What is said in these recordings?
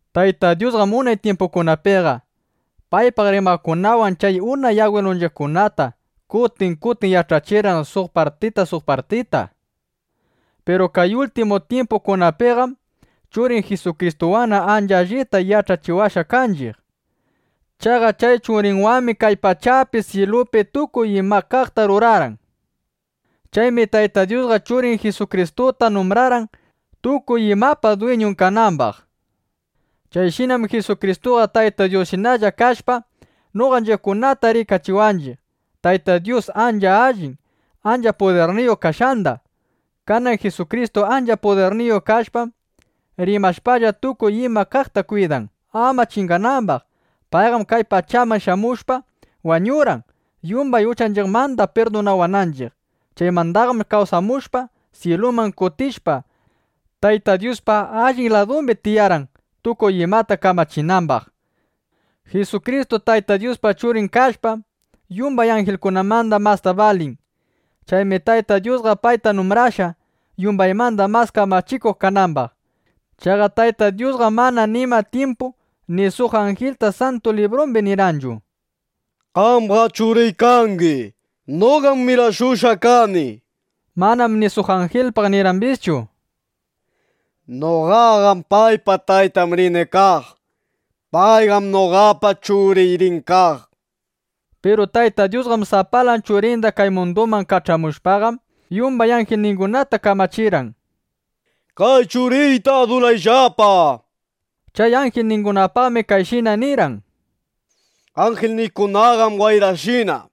Tayta Dyusqam unay tyimpukunapiqa paypaq rimaqkunawan chay unay agwilunchiqkunata kutin kutin yach'achirqan suq partita, suq partita. Piru kay ultimu tyimpukunapiqam Churin Jisukristuwanna ancha allita yach'achiwashqa kanchiq. Chaqa chay Churinwanmi kay pachapi syilupi tukuy ima kaqta rurarqan. Chaymi Tayta Dyusqa Churin Jisukristuta numbrarqan, tukuy imapa dwiñun kanambaq. Chayshinam Jisukristuqa Tayta Dyusshinalla kashpa, noqanchiqkunata rikachiwanchiq Tayta Dyus ancha allin, ancha pudirniyuq kashqanda. Kanan Jisukristu ancha pudirniyuq kashpam, rimashpalla, tukuy ima kaqta kwidan, ama chinganambaq. Payqam kay pachaman shamushpa, wañurqan, yumbay uchanchiqmanda pirdunawananchiq. Chaymandaqam kawsamushpa, syiluman kutishpa, Tayta Dyuspa allin ladumbi tiyarqan, tukuy imata kamachinambaq. Jisukristu Tayta Dyuspa Churin kashpam, yumbay anjilkunamanda masta balin. Chaymi Tayta Dyusqa payta numbrashqa, yumbaymanda mas kamachikuq kanambaq. Chaqa Tayta Dyusqam mana nima tyimpu ni suq anjilta Santu Librumbi nirqanchu: Qamqam Churiy kangi; noqam mirashushqa kani, nishpaqa. Manam ni suq anjilpaq nirqambischu: Noqaqam paypa taytan rini kaq. Payqam noqapa churiy rin kaq, nishpaqa. Piru Tayta Dyusqa sapalan Churinda kay munduman kach'amushpaqam, yumbay anjilningunata kamachirqan: Kay Churiyta adurayllapa, nishpa. Chay anjilningunapaqmi kayshina nirqan: Anjilniykunaqam wayrashina,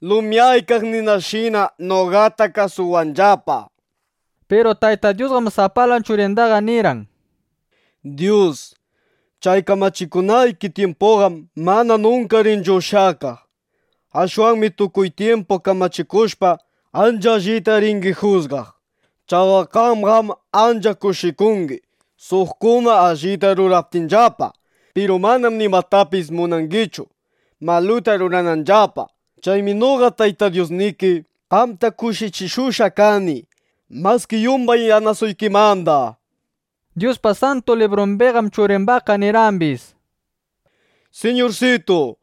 lumyaykaq ninashina noqata kasuwanllapa, nishpa. Piru Tayta Dyusqam sapalan Churindaqa nirqan: Dyus, chay kamachikunayki tyimpuqam mana nunka rinchu ushyakaq. Ashwanmi tukuy tyimpu kamachikushpa, ancha allita ringi jusgaq. Chaqa qamqam ancha kushikungi, suqkuna allita ruraptinllapa. Piru manam nimatapis munangichu, maluta rurananllapa. Chaymi noqa Tayta Dyusniki qamta kushichishushqa kani maski yumbay yanasuykimanda (yanasaykimanda), nishpa. Dyuspa Santu Librumbiqam Churimbaqqa nirqambis: Siñursitu,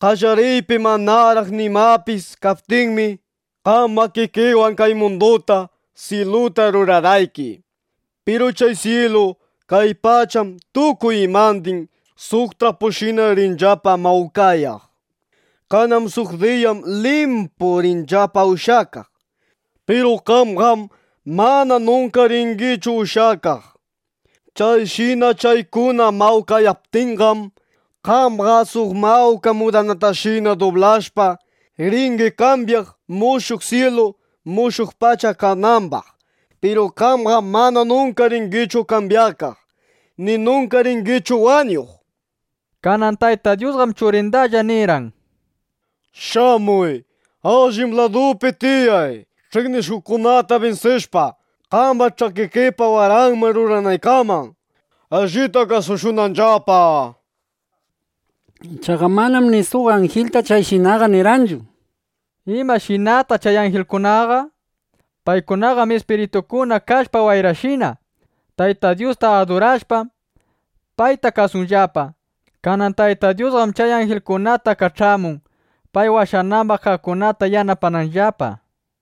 qallariypi manaraq nimapis kaptinmi, qam makikiwan kay munduta, syiluta rurarqayki. Piru chay syilu, kay pacham, tukuy imandin suq trapushina rinllapa mawkayaq. Kanan suq diyam limpu rinllapa ushyakaq. Piru qamqam mana nunka ringichu ushyakaq. Chayshina chaykuna mawkayaptinqam, qamqa suq mawka mudanatashina dublashpa, ringi kambyaq, mushuq syilu, mushuq pacha kanambaq. Piru qamqam mana nunka ringichu kambyakaq, ni nunka ringichu wañuq, nishpa. Kanan Tayta Dyusqam Churindalla nirqan: Shamuy; allin laduypi tiyay, ch'iqnishuqkunata binsishpa, qamba ch'akikipa waranman runaykaman, allita kasushunanllapa, nishpa. Chaqa manam ni suq anjilta chayshinaqa nirqanchu. ¿Imashinataq chay anjilkunaqa? Paykunaqam ispiritukuna kashpa wayrashina. Tayta Dyusta adurashpam, payta kasunllapa. Kanan Tayta Dyusqam chay anjilningunata kach'amun, pay washanambaq kaqkunata yanapananllapa.